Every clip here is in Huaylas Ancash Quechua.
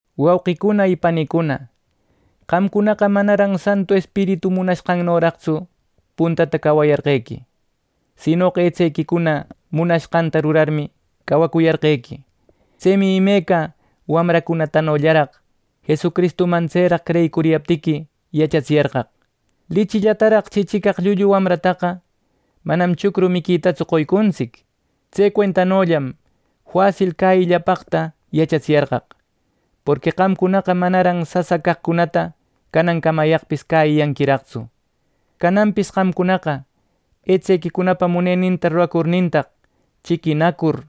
Wauqicuna y panicuna, qamcunaqa manaran Santu Espiritu munanqannoraqtsu puntata cawayarquequi; sinoqa etsequicuna munashqanta rurarmi cawacuyarqequi. Tsemi imeca wamracunatanollaraq Jesucristuman tseraq creyicuriyaptiqui yachatsiyarqaq. Lichillataraq chichicaq llullu wamrataqa manam chucru miquitatsu qoycuntsic. Tse cuentanollam fasil cäyiquillapaqta yachatsiyarqaq, porqui qamcunaqa manaran sasa caqcunata canan camayaqpis cäyiyanquiraqtsu. Cananpis qamcunaqa etsequicunapa muneninta ruracurnintaq chiquinacur,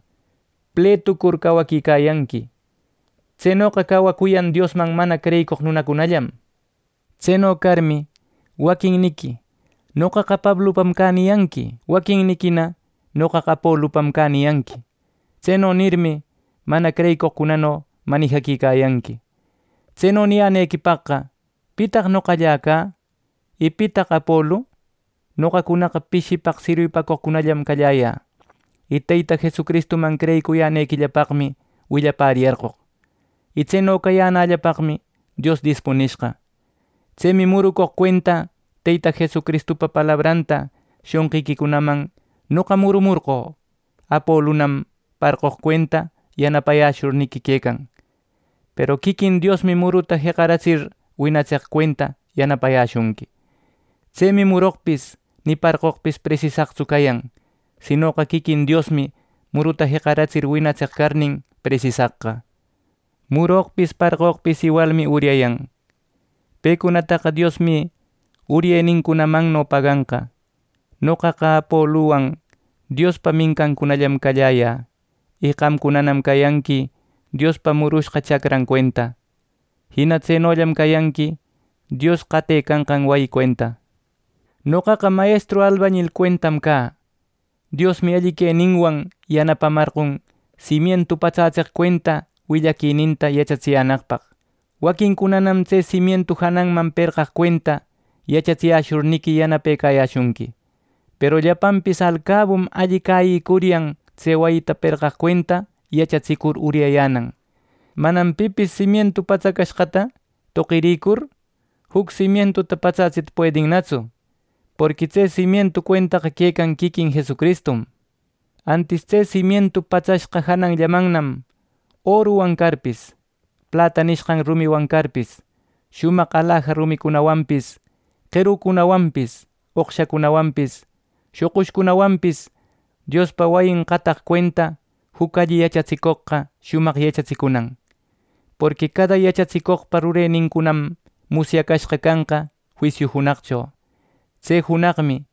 pletucur cawaquicayanqui. Tsenoqa cawacuyan Diosman mana creyicoq nunacunallam. Tseno carmi, waquinniqui “Noqaqa Pablupam cä” niyanqui. Waquinniquina “Noqaqa Apolupam cä” niyanqui. Tseno nirmi, mana creyicoqcunano manijaquicayanqui. Tseno niyänequipaqqa ¿pitaq noqallä cä! Y ¿pitaq Apolu! Noqacunaqa pishipaq sirwipacoqcunallam calläyä, y Teyta Jesucristuman creyicuyänequillapaqmi willapäriyarqoq, y tseno cayänällapaqmi Dios dispunishqa. Tsemi murucoq cuenta Teyta Jesucristupa palabranta shonqiquicunaman noqa murumorqö. Apolunam parqoq cuenta yanapayäshurniqui quecan, peru quiquin Diosmi muruta jeqaratsir winatseq cuenta yanapayäshunqui. Tsemi muroqpis ni parqoqpis presisaqtsu cayan; sinoqa quiquin Diosmi muruta jeqaratsir winatseq carnin presisaqqa. Muroqpis parqoqpis iwalmi uryayan. Pecunataqa Diosmi uryenincunamanno paganqa. Noqaqa Apoluwan Diospa mincancunallam calläyä y qamcunanam cayanqui Diospa murushqa chacran cuenta. Jina tsenollam cayanqui Dios qatecanqan wayi cuenta. Noqaqa mayestru albañil cuentam cä. Diosmi alli queninwan yanapamarqon simientu patsätseq cuenta willaquininta yachatsiyänaqpaq. Waquincunanam tse simientu jananman perqaq cuenta yachatsiyäshurniqui yanapecayäshunqui, peru llapanpis alcabum alli cäyicuryan tse wayita perqaq cuenta yachatsicur uryayänan. Manam pipis simientu patsacashqata toqirïcur juc simientuta patsätsita puedinnatsu, porqui tse simientu cuentaqa quecan quiquin Jesucristum. Antis tse simientu patsashqa jananllamannam oruwan carpis, plata nishqan rumiwan carpis, shumaq alaja rumicunawanpis, qerucunawanpis, oqshacunawanpis, shoqushcunawanpis, Diospa wayin qataq cuenta juc alli yachatsicoqqa shumaq yachatsicunan. Porqui cada yachatsicoqpa rurenincunam musyacashqa canqa juisiu junaqcho. Tse junaqmi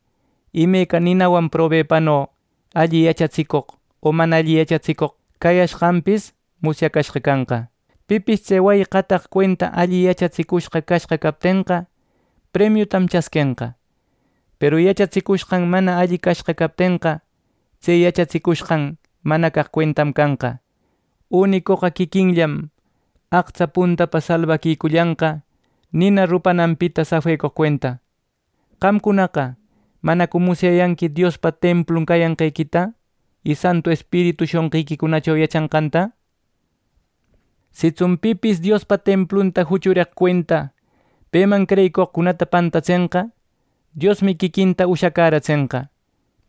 imeca ninawan probepano alli yachatsicoq o mana alli yachatsicoq cayashqanpis musyacashqa canqa. Pipis tse wayi qataq cuenta alli yachatsicushqa cashqa captenqa, premiutam chasquenqa; peru yachatsicushqan mana alli cashqa captenqa, tse yachatsicushqan mana caq cuentam canqa; unicoqa quiquinllam aqtsa puntapa salbaquicullanqa nina rupananpita safecoq cuenta. Qamcunaqa ¿manacu musyayanqui Diospa templun cayanqequita, y Santu Espiritu shonqiquicunacho yachanqanta! Sitsun pipis Diospa templunta juchureq cuenta peman creyicoqcunata pantatsenqa, Diosmi quiquinta ushacäratsenqa;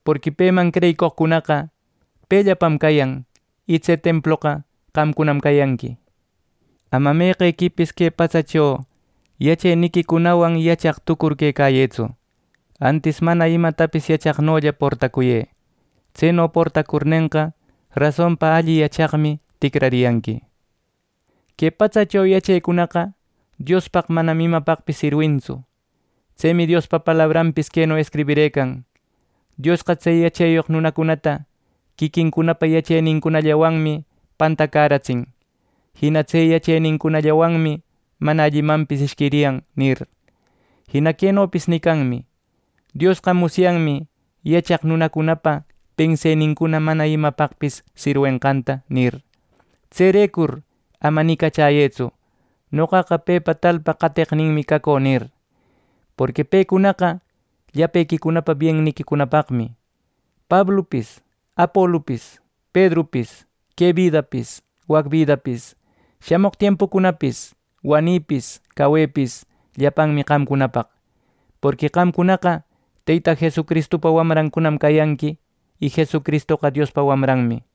porqui peman creyicoqcunaqa pellapam cayan, y tse temploqa qamcunam cayanqui. Ama meqequipis que patsacho yacheniquicunawan yachaq tucur quecayëtsu; antis mana imatapis yachaqnolla portacuyë. Tseno portacurnenqa, rasonpa alli yachaqmi ticrariyanqui. Que patsacho yachecunaqa Diospaq manam imapaqpis sirwintsu. Tsemi Diospa palabranpis queno escribirëcan: “Diosqa tse yacheyoq nunacunata, quiquincunapa yachenincunallawanmi pantacäratsin. Jina tse yachenincunallawanmi mana allimanpis ishquiriyan” nir. Jina quenopis nicanmi: “Diosqa musyanmi yachaq nunacunapa pensenincuna mana imapaqpis sirwishqanta” nir. Tserecur ama nicachäyëtsu, “Noqaqa pepa, talpa qateqninmi cacü” nir. Porqui pecunaqa llapequicunapa bienniquicunapaqmi. Pablupis, Apolupis, Pedrupis, que bidapis, wac bidapis, shamoq tiempucunapis, wanipis, cawepis, llapanmi qamcunapaq. Porqui qamcunaqa Teyta Jesucristupa wamrancunam cayanqui y Jesucristoqa Diospa wamranmi.